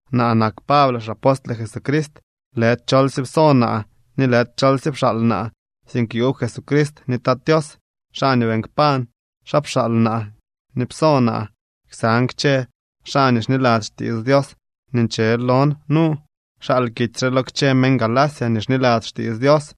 Naa nak Pable, xapostle Jesucrist. Lëdy cholsye pso naa ni lëdy cholsye pxaal naa, sink yuub Jesucrist ni Tat Tios, xaa nii beeñ kpañ xaa pxaal naa ni pso naa. Ksan kchë xaa nii xniladzy xtiits Dios nii nche lon nu, xal kitsy re lo kchë meñ Galacia nii xniladzy xtiits Dios.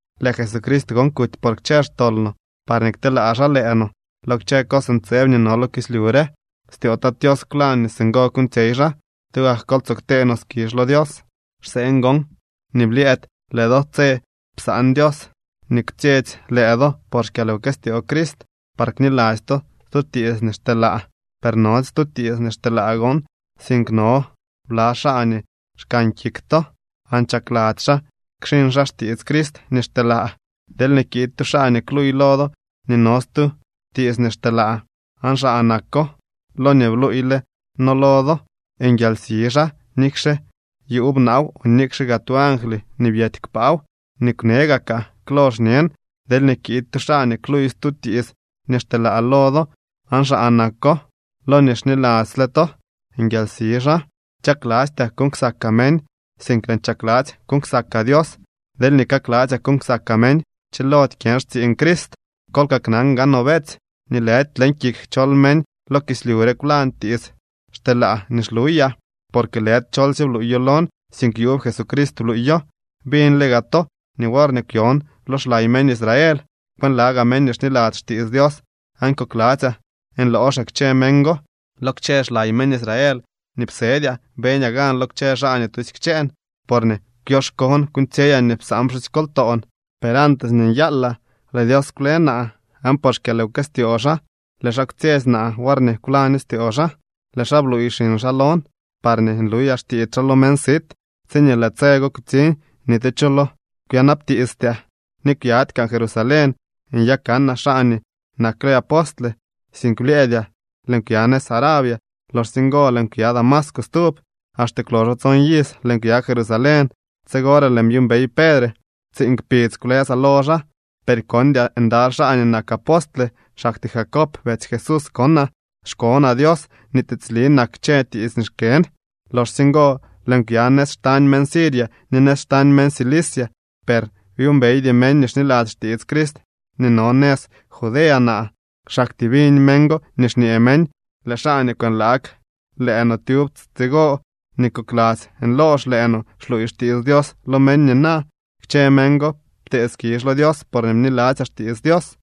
Lëë Jesucrist gon kuty por kchë xtol no, parñee kteelaa xaa lëë no lo kchë cos ntseeb nii no lo kislyu re. Styoo Tat Tios kwlañ nii singo kuuñtsyey xaa. ¡Tugak kol tsoo ktee no skizh lo Dios! Xseen gon nii blyëëdy lëë do tse psaan Dios nii kwtsyetsy lëë do por xkyalwkëstyoo Crist, par kniladzy to stu tiits nii xteelaa. Per nody stu tiits nii xteelaa gon, sink no bla xaa nii xkan kik to aan chakladzy xaa kxiñ xaa xtiits Crist nii xteelaa. Deelñee kiid tu xaa nii kluuy lo do nii no stu tiits nii xteelaa aan xaa nako lo nii bluuyle noo lo do, nguialsi xaa nikxe yuub naaw o nikxe gaa tu angly nii byety kpaaw. Nii kwne gakaa klo, xñen: Deelñee kiid tu xaa nii kluuy stu tiits nii xteelaa lo do aan xaa nako lo nii xniladzyle to, nguialsi xaa. Chaklastyaa kuuñ ksakaa meñ, sink lëën chakladzy kuuñ ksakaa Dios. Deelñee kakladzyaa kuuñ ksakaa meñ, chilody kyën xtsiiñ Crist. Kol kaknan gaanoo, beetsy, nii lëdy leñ kik chol meñ lo kislyu re kwlañ tiits xteelaa nii xluyaa. Porque lëdy cholsye bluuyo lon, sink yuub Jesucrist bluuyo. Biñle gaa to nii worñee kwyon lo xlay meñ Israel, kwënlagaa meñ nii xniladzy xtiits Dios aan kokladzyaa nlooxaa kchë meñ go. Lo kchë xlaay meñ Israel nii psedyaa beñaa gan lo kchë xaa nii tusy kchëën, porñee kwyoxkoon kuuñtsyeyaa nii psaan pxusykoltoon. Per antes nii nyalyaa lëë Dios kwle naa, aan por xkyalwkëstyoo xaa lëë xaa kwtsyetsy naa worñee kwlaño styoo xaa. Lëë xaa bluuy xiñ xaa lon, parñee nluyaa xtiits xaa lo meñ sit. Tsiñee lëë tse go kutsiñ ni tu cho lo kwyanabtiistyaa, ni kwyady kaan Jerusalén nyakanaa xaa nii nakle apostle. Sink blyëëdyaa lëën kwya nëz Arabia, loxsye ngo lëën kwya Damasco stub. Axte kwloxo tson iz lëën kwya Jerusalén. Tsigore lëën byuumbey Pedre. Tsiiñ kpidz kwlësaa lo xaa. Per kondyaa ndaly xaa nii nak apostle, xaktyee Jacob betsy Jesús konaa. Xkonaa Dios nii tiitsli nak kchë tiits nii xkën. Loxsye ngo lëën kwya nëz xtañ meñ Siria ni nëz xtañ meñ Cilicia. Per byuumbeydy meñ nii xniladzy xtiits Crist nii no nëz Judea naa. Xaktyee biñ meñ go nii xñee meñ: “Lëë xaa nii kwënlaag lëë no tyub tsigo, ni kokladzy nloox lëë no, xluuy xtiits Dios lo meñ nina.” Kchë meñ go ptee skizh lo Dios porñee bniladzyaa xtiits Dios.